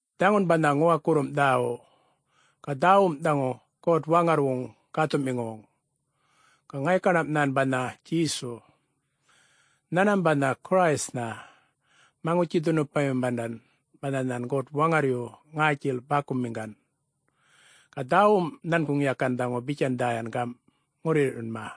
Dhaŋun banha ŋuwakurrum dhäwu. Ga dhäwum dhaŋu God-Waŋarrwuŋun Gäthuꞌmiŋuwuŋ, ga ŋaykaṉam nhan banha Djesu. Nhanmam banha Christnha, Maŋutji-dhunupayumandan banha nhan God-Waŋarryu ŋätjil bäkumiŋgan. Ga dhäwum nhanguŋ yakan dhaŋu bitjan dhäya gamꞌ ŋurruyirrꞌyunma: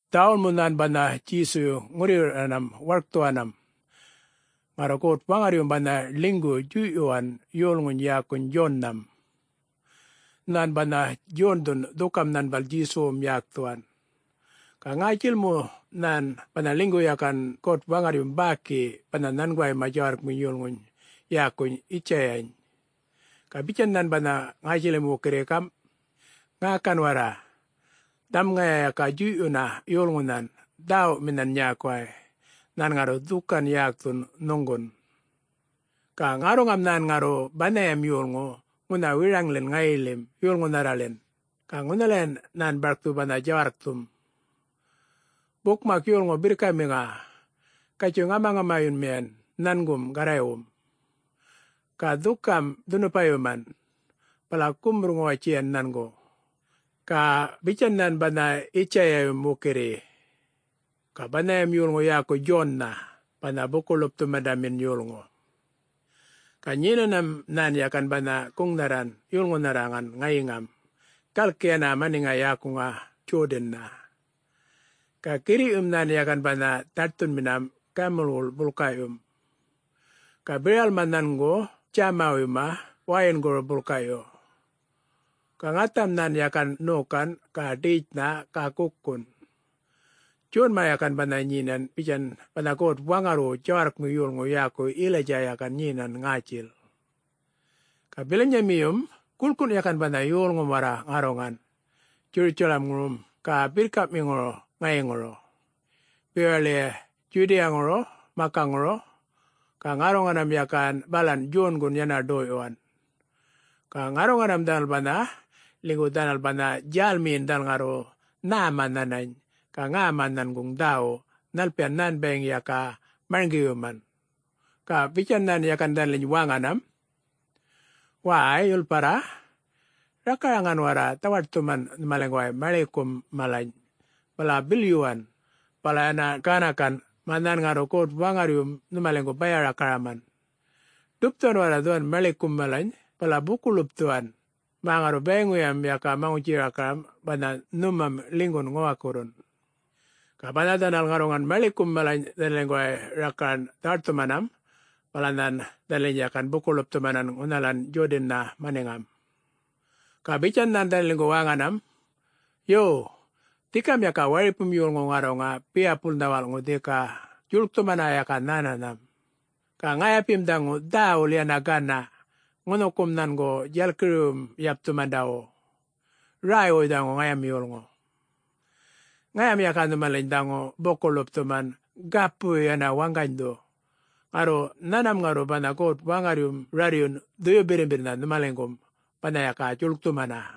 Dhäwul mu nhan banha Djesuyu ŋurruyirrꞌyuwanam warkthuwanam, ŋarru God-Waŋarryum banha ḻinygu djuyꞌyuwan yolŋuny yäkuny Djonnham. Nhän banha Djondhu dhukam nhanbal Djesuwum yäkthuwan. Ga ŋätjil mu nhan banha ḻinygu yakan God-Waŋarryum bäki banha nhanguwayma djawarrkminy yolŋuny yäkuny Yitjayany. Ga bitjan nhan banha ŋätjilim wukirri gamꞌ: “Ŋäkan warra! Dhaŋum ŋaya yaka djuyꞌyuna yolŋunhan dhäwuminhan nyäkuway. Nhan ŋarru dhukan yäkthun nhuŋgun. Ga ŋarruŋam nhan ŋarru banhayam yolŋu ŋunha wiraŋḻin ŋayiḻim yolŋunharraḻin, ga ŋunhalayan nhan barkthu banha djawarrkthum, ‘Bukmak yolŋu birrkamiŋa, gatjuy, ŋamaŋamayunmiyan nhangum Garraywum. Ga dhukam dhunupayuman, bala gumurr-ŋuwatjiyan nhangu.’” Ga bitjan nhan banha Yitjayayum wukirri. Ga banhayam yolŋu yäku Djonnha banha Buku-ḻupthumandamin yolŋu. Ga nyenanam nhan yakan banha guŋnharran yolŋunharraŋan ŋayiŋam galki yana maniŋa yäkuŋa Djodannha. Ga girriꞌyum nhan yakan banha dhaṯthunminam gamulwuḻ bulkaꞌyum, ga biralma nhangu djämawuyma wäyinguru bulkaꞌyu. Ga ŋatham nhan yakan ṉokan ga ḏetjnha ga gukun. [Djonma yakan banha nyenan bitjan banha God-Waŋarrwu djawarrkmi yolŋu yäku Yilaydja yakan nyenan ŋätjil.] Ga bilanyamiyum guḻkun yakan banha yolŋum warra ŋarruŋan Djurutjalamŋurum ga birrkamiŋuru ŋayiŋuru bewaḻi Djudiyaŋuru makaŋuru, ga ŋarruŋanam yakan balan Djongun yana ḏoyꞌyuwan. Ga ŋarruŋanam dhanal banha, ḻinygu dhanal banha djälmiyin dhanal ŋarru nhäma nhanany, ga ŋäma nhanguŋ dhäwu nhalpiyan nhan bayiŋ yaka marŋgiyuman. Ga bitjan nhan yakan dhanaliny wäŋanam, “Wäy, yulparra, rakaraŋan warra dhawaṯthuman nhumaliŋguway maḻikum malany, bala bilyuwan, bala yana ganakan, mä nhan ŋarru God-Waŋarryum nhumaliŋgu baya-rakaraman. Ḏupthuwan warra dhuwan maḻikum malany bala buku-ḻupthuwan mä ŋarru bayiŋuyam yaka maŋutji-rakaram banha nhumam ḻinygun ŋuwakurrun.” Ga banha dhanal ŋarruŋan maḻikum malany dhanaliŋguway rakaran dhawaṯthumanam, bala nhan dhanaliny yakan buku-ḻupthumanan ŋunhalan Djodannha maniŋam. Ga bitjan nhan dhanaliŋgu wäŋanam, “Yo, dhikam yaka waripum yolŋu ŋarruŋa biyapulnha walꞌŋu dhika djuḻkthumana yaka nhänanham. Ga ŋayapim dhaŋu dhäwul yana ganaꞌ ŋunhukum nhangu djalkiriwuywum yapthumandawu. Räywuy dhaŋu ŋayam yolŋu. Ŋayam yaka nhumaliny dhaŋu buku-ḻupthuman gapuyu yana waŋganydhu, ŋarru nhanmam ŋarru banha God-Waŋarryum rarryun Dhuyu Birrimbirrnha nhumaliŋgum, banha yaka djuḻkthumana.”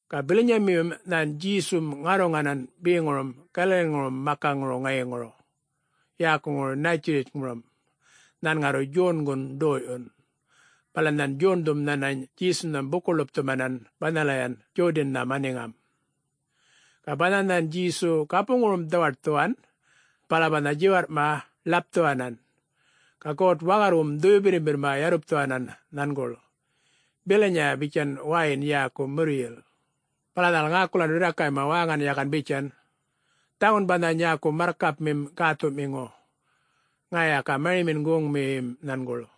Ga bilanyamiyum nhan Djesum ŋarruŋanan beŋurum Galaliŋurum makaŋuru ŋayiŋuru, yäkuŋuru Nätjiritjŋurum, nhan ŋarru Djongun ḏoyꞌyun. Bala nhan Djondhum nhanany Djesunham buku-ḻupthumanan banhalayan Djodannha maniŋam. Ga banha nhan Djesu gapuŋurum dhawaṯthuwan, bala banha djiwarrꞌma ḻapthuwanan. Ga God-Waŋarrwum Dhuyu Birrimbirrma yarrupthuwanan nhanguḻ bilanyan bitjan wäyin yäku murryil. Bala dhanal ŋäkulan rirrakayma wäŋan yakan bitjan, “Dhaŋun banha nyäku marrkapmim gäthuꞌmiŋu. Ŋaya yaka marimin goŋmiyim nhanguḻ.”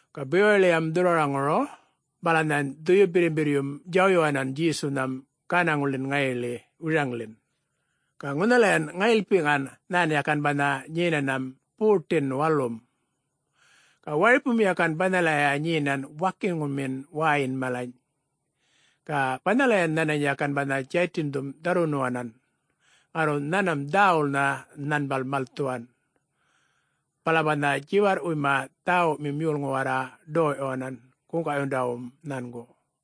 Ga bewaḻiyam dhurrwaraŋuru, bala nhän Dhuyu Birrimbirryum djawyuwanan Djesunham gänaŋuḻin ŋayiḻi wiraŋḻin. Ga ŋunhalayan ŋayilpiꞌŋan nhan yakan banha nyenanam 40-n walum. Ga waripum yakan banhalaya nyenan wakinŋumin wäyin malany. Ga banhalayan nhanany yakan banha Djaytindhum dharrwunuwan. Ŋarru nhanmam dhäwulnha nhanbal malthuwan. Bala banha djiwarrꞌpuyma dhäwumim yolŋu warra ḏoyꞌyuwanan guŋgaꞌyundawum nhangu.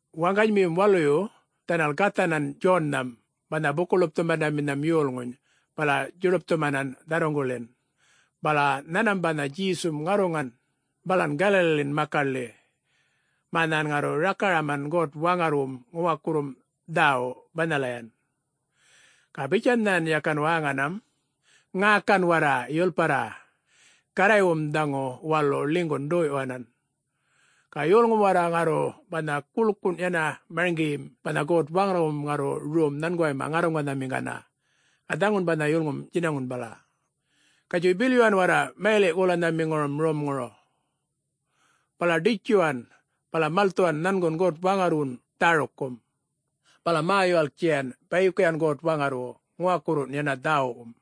Waŋganymiyum waluyu dhanal gathanan Djonnham banha Buku-ḻupthumandaminham yolŋuny bala djuḏupꞌthumanan dharruŋguḻin. Bala nhanmam banha Djesum ŋarruŋan balan Galaliḻin makaḻi, mä nhan ŋarru rakaraman God-Waŋarrwum ŋuwakurrum dhäwu banhalayan. Ga bitjan nhan yakan wäŋanam, “Ŋäkan warra, yulparra! Garraywum dhaŋu walu ḻinygun ḏoyꞌyuwanan! Ga yolŋum warra ŋarru banha guḻkun yana marŋgiyim banha God-Waŋarrwum ŋarru rom nhanguway ŋarruŋanhamiŋgana, ga dhaŋun banha yulŋum djinaŋun bala. Gatjuy bilyuwan warra mayaliꞌ-golanhamiŋurum romŋuru, bala ḏitjuwan, bala malthuwan nhangun God-Waŋarrwun dhärukkum. Bala mä-yuwalktjiyan bayikuyan God-Waŋarrwu ŋuwakurruwun yana dhäwuꞌwum.”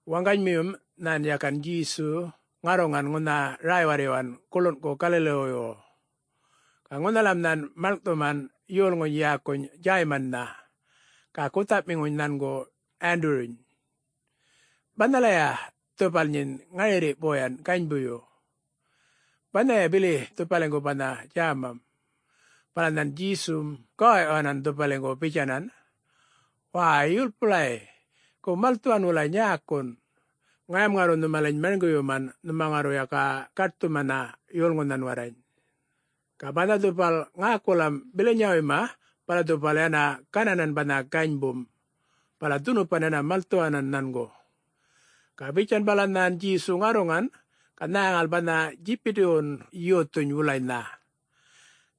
Waŋganymiyum nhan yakan Djesu ŋarruŋan ŋunha räy-warryuwan guḻunꞌgu Galaliwuywu. Ga ŋunhalam nhan maḻŋꞌthuman yolŋuny yäkuny Djäymannha ga guthaꞌmiŋuny nhangu Wanduruny. Banhalaya dhupal nyin ŋarirri boyan ganybuyu. Banhayan bili dhupaliŋgu banha djämam. Bala nhan Djesum gawaꞌyuwanan dhupaliŋgu bitjanan, “Wäy, yulpulay! Gu malthuwan wulay nyäkun. Ŋayam ŋarru nhumaliny marŋgiyuman nhuma ŋarru yaka gaṯthuman yolŋunhan warrany.” Ga banha dhupal ŋäkulam bilanyawuyma bala dhupal yana gananan banha ganybum, bala dhunupan yana malthuwanan nhangu. Ga bitjan bala nhan Djesu ŋarruŋan ga nhäŋal nhan Djibidiwun yothuny wulanynha.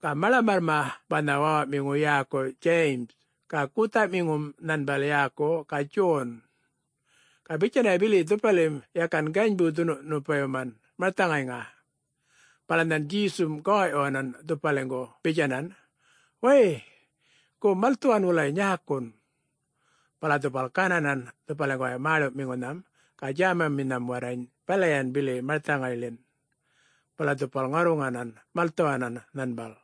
Ga maḻamarrma banha wäwaꞌmiŋu yäku Djayim ga guthaꞌmiŋum nhanbal yäku ga Djon. Ga bitjanaya bili dhupalim yakan ganybu dhunupayuman marthaŋayŋa. Bala nhan Djesum gawaꞌyuwanan dhupaliŋgu bitjanan, “Wäy, gu malthuwan wulay nyäkun!” Bala dhupal gananan dhupaliŋguway mäḻuꞌmiŋunham ga djämaminham warrany balayan bili marthaŋayḻin. Bala dhupal ŋarruŋanan malthuwanan nhanbal.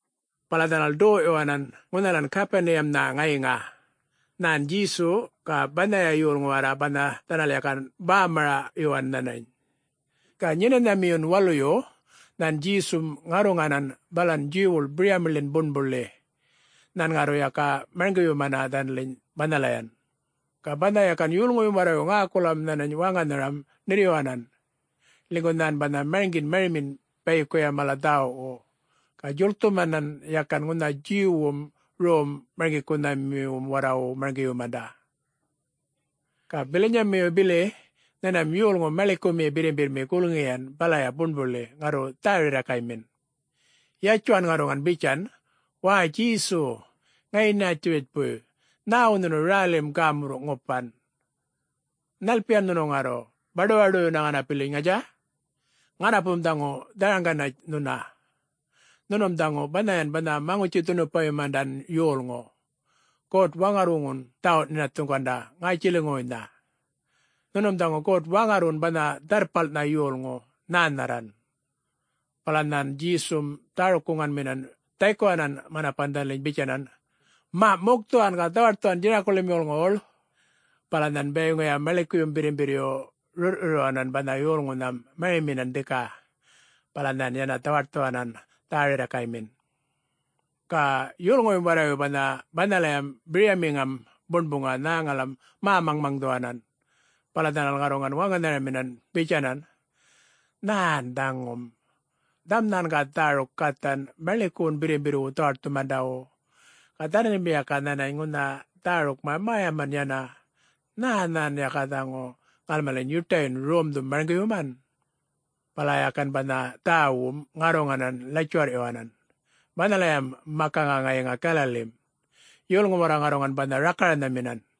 Bala dhanal ḏoyꞌyuwanan ŋunhalan Gapuniyamnha ŋayiŋa, nhan Djesu ga banhaya yolŋu warra banha dhanal yakan bämaraꞌyuwan nhanany. Ga Nyenanhamiyun Waluyu, nhan Djesum ŋarruŋanan balan Djuwwuḻ biryamiḻin buṉbuḻi, nhan ŋarru yaka marŋgiyumana dhanaliny banhalayan. Ga banha yakan yolŋuyum warrayu ŋäkulam nhanany wäŋanharam ṉirryuwanan, ḻinygu nhan banha marŋgin marimin bayikuya mala dhäwuꞌwu. Ga djuḻkthumanhan yaka ŋunha Djuwwum rom-marŋgikunhamiwum warrawu marŋgiyumanda. Ga bilanyamiyu bili nhanmam yolŋu maḻikumi birrimbirrmi gulŋiyan balaya buṉbuḻi ŋarru dhä-rirrakaymin, yatjuwan ŋarruŋan bitjan, “Wäy, Djesu ŋayi Nätjuritjpuy, nhäwu nhunu rälim gämurruꞌ ŋupan? Nhalpiyan nhunu ŋarru, baḏuwaḏuyunna ŋanapiliny, ŋatja? Ŋanapum dhaŋu dharaŋganatj nhuna, nhunum dhaŋu banhayan banha Maŋutji-dhunupayumandan yolŋu God-Waŋarrwuŋun dhawuꞌ-nhinathuŋganda ŋätjiliŋuwuynha. Nhunum dhaŋu God-Waŋarrwun banha Dharrpalnha Yolŋu, nhänharran.” Bala nhan Djesum dhäruk-guŋganminan dhaykuwanan manapan dhanaliny bitjanan, “Maꞌ mukthuwan, ga dhawaṯthuwan djinakuḻiyam yolŋuwuḻ!” Bala nhan bayiŋuya maḻikuyum birrimbirryu rurrꞌrurryuwanan banha yolŋunham mariminan dhika. Bala nhan yana dhawaṯthuwanam dhä-rirrakaymin. Ga yolŋuyum warrayu banha banhalayam biryamiŋam buṉbuŋa nhäŋalam mä-maŋmaŋdhuwanan. Bala dhanal ŋarruŋan wäŋanharaminan bitjanan, “Nhän dhaŋum? Dhaŋum nhan ga dhäruk gathan maḻikuwun birrimbirrwu dhawaṯthumandawu, ga dhanalim yaka nhanany ŋunha dhärukma mäyaman yana. Nhä nhan yaka dhaŋu ŋalmaliny yuṯayun romdhum marŋgiyuman?” Bala yakan banha dhäwum ŋarruŋanan ḻatjuwarrꞌyuwanan banhalayam makaŋa ŋayiŋa Galalim. Yolŋum warra ŋarruŋan banha rakaranhaminan.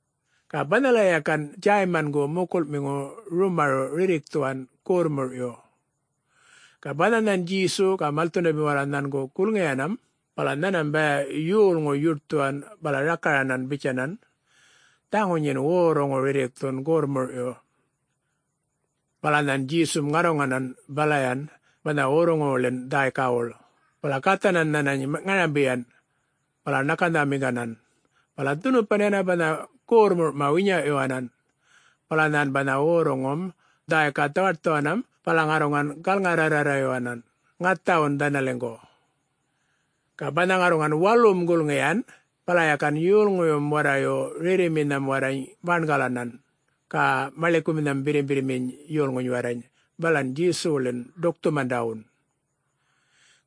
Ga banhalaya yakan Djäymangu mukulꞌmiŋu rumaruꞌ rirrikthuwan gorrmurꞌyu. Ga banha nhan Djesu ga malthundamim warra nhangu gulŋiyanam, bala nhanmam baya yolŋu yuṯthuwan bala rakaranan bitjanan, “Dhaŋu nyin worruŋu rirrikthun gorrmurꞌyu.” Bala nhan Djesum ŋarruŋanan balayan banha worruŋuwuḻin dhäykawuḻ, bala gathanan nhanany ŋarambiyan bala ṉakanhamiŋganan. Bala dhunupan yana banha gorrmurꞌma winyaꞌyuwanan. Bala nhan banha worruŋum dhäyka dhawaṯthuwanam bala ŋarruŋan galŋa-rrarrayuwanan ŋathawun dhanaliŋgu. Ga banha ŋarruŋan walum gulŋiyan, bala yakan yolŋuyum warrayu rerriminham warrany bangalanan, ga maḻikuminham birrimbirrminy yolŋuny warrany balan Djesuwuḻin ḏukthumandawun.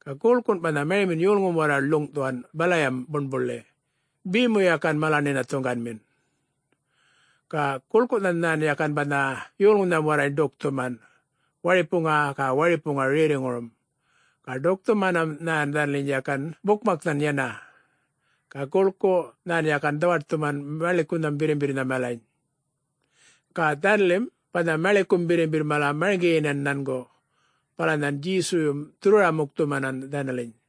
Ga guḻkun banha marimin yolŋum warra ḻuŋꞌthuwan balayam buṉbuḻi, be mu yakan mala-nhinathuŋganmin. Ga guḻkunhan nhan yakan banha yolŋunham warrany ḏukthuman, waripuŋa ga waripuŋa rerriŋurum. Ga ḏukthumanam nhan dhanaliny yakan bukmaknhan yana. Ga guḻku nhan yakan dhawaṯthuman maḻikunham birrimbirrnha malany. Ga dhanalim banha maḻikum birrimbirr mala marŋgiyinan nhangu, bala nhan Djesuyum dhurrwara-mukthumanan dhanaliny.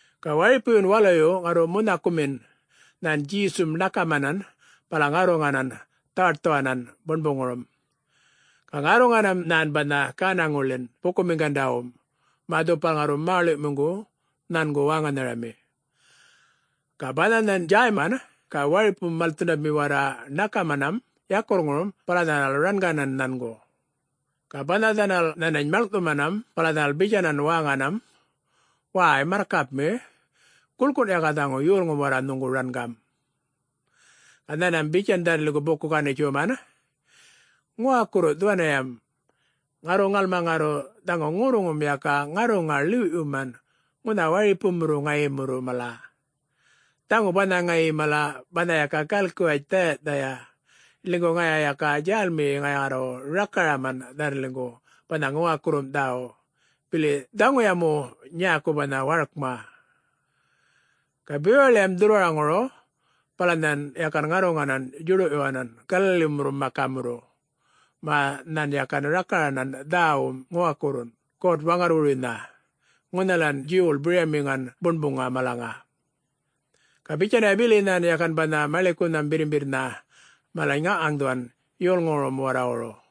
Ga waripuyun waluyu ŋarru munhakumin, nhan Djesum ṉakamanan bala ŋarruŋanan dhawaṯthuwanan buṉbuŋurum. Ga ŋarruŋanam nhan banha gänaŋuḻin bukumiŋgandawum mä dhupal ŋarru Mäḻuꞌmiŋu nhangu wäŋanharami. Ga banha nhan Djäyman ga waripum malthundami warra ṉakamanam yakurrŋurum bala dhanal ranganan nhangu. Ga banha dhanal nhanany maḻŋꞌthumanam bala dhanal bitjanan wäŋanam, “Wäy! Marrkapmi, guḻkun yaka dhaŋu yolŋum warra nhuŋu rangam.” Ga nhanmam bitjan dhanaliŋgu buku-ganitjuman, “Ŋuwakurru dhuwaniyam. Ŋarru ŋalma ŋarru dhaŋu ŋurruŋum yaka ŋarruŋa ḻiwꞌyuman ŋunha waripumurru ŋayimurru mala. Dhaŋu banha ŋayi mala banha yaka galkiwatj dhäyaꞌdhaya. Ḻinygu ŋaya yaka djälmiyi ŋaya ŋarru rakaraman dhanaliŋgu banha Ŋuwakurrum Dhäwu, bili dhaŋuya mu nyäku banha warkma.” Ga bewaḻiyam dhurrwaraŋuru bala nhan yakan ŋarruŋanan djuḏuꞌyuwanan Galalimurrun makamurru, mä nhan yakan rakaranan dhäwun ŋuwakurrun God-Waŋarrwuruynha ŋunhalan Djuwwuḻ biryamiŋan buṉbuŋa malaŋa. Ga bitjanaya bili nhan yakan banha maḻikunham birrimbirrnha malany ŋaŋꞌŋaŋdhuwan yolŋuwurum warrawuru.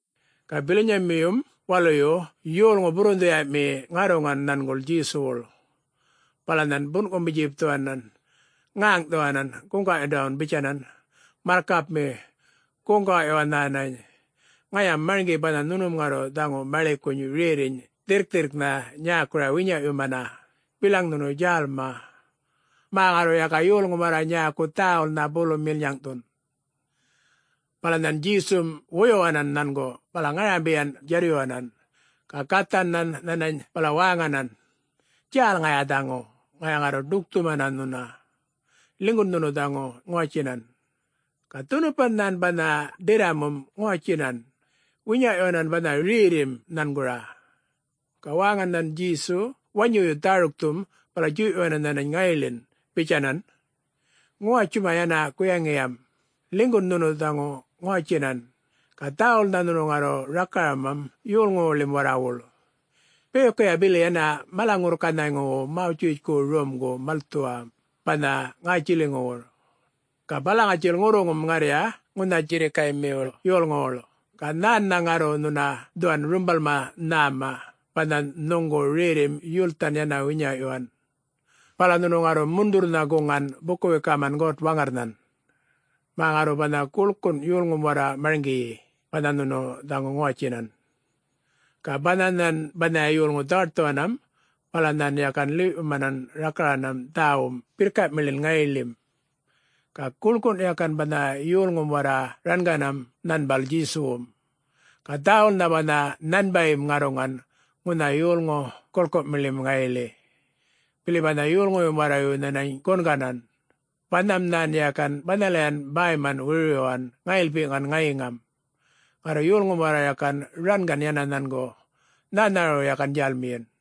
Ga bilanyamiyum waluyu yolŋu burrunhdhiyaꞌmi ŋarruŋan nhanguḻ Djesuwuḻ. Bala nhan bunꞌkumu-djipthuwanan ŋäŋꞌthuwanan guŋgaꞌyundawun bitjanan, “Marrkapmi, guŋgaꞌyuwa nhänany! Ŋayam marŋgi banha nhunum ŋarru dhaŋu maḻikuny rerriny dhirrkthirrknha nyäkuru winyaꞌyumana, bilaŋ nhunu djälma, mä ŋarru yaka yolŋum warra nyäku dhäwulnha bulum milnyaŋꞌthun.” Bala nhan Djesum wuyuwanan nhangu bala ŋarambiyaꞌ djarryuwanan, ga gathan nhan nhanany bala wäŋanan, “Djäl ŋaya dhaŋu, ŋaya ŋarru ḏukthumana nhuna. Ḻinygun nhunu dhaŋu ŋuwatjinan!” Ga dhunupan nhan banha ḏirramum ŋuwatjinan, winyaꞌyuwanan banha rerrim nhangura. Ga wäŋan nhan Djesu wanyuyun dhärukthum bala djuyꞌyuwanan nhanany ŋayiḻin bitjanan, “Ŋuwatjuma yana guyaŋiyam! Ḻinygun nhunu dhaŋu ŋuwatjinan, ga dhäwulnha nhunu ŋarru rakaramam yolŋuwuḻim warrawuḻ. Bayikuya bili yana mala-ŋurrkanhayŋuwu Mawtjitjku romgum malthuwa banha ŋätjiliŋuwun. Ga bala ŋatjil ŋurruŋum ŋarrya ŋunha djirrikaymiwuḻ yolŋuwuḻ ga nhän ŋarru nhuna dhuwan rumbalma nhäma banha nhuŋgu rerrim yulthan yana winyaꞌyuwan. Bala nhunu ŋarru mundhurrnha guŋgan buku-wikaman God-Waŋarrnhan, mä ŋarru banha guḻkun yolŋum warra marŋgiyi banha nhunu dhaŋu ŋuwatjinan.” Ga banha nhan banhaya yolŋu dhawaṯthuwanam bala nhan yakan ḻiwꞌyumanan rakaranam dhäwum birrkaꞌmilin ŋayilim. Ga guḻkun yakan banha yolŋum warra ranganam nhanbal Djesuwum. Ga dhäwulnha banha nhanbayim ŋarruŋan ŋunha yolŋu guḻkumiḻim ŋayiḻi, bili banha yolŋuyum warrayu nhanany gunganan, banham nhan yakan banhalayan bäyman wirwiryuwanam ŋayilpiꞌŋan ŋayiŋam. Ŋarru yolŋum warra yakan rangan yana nhangu, nhänharawun yakan djälmiyin.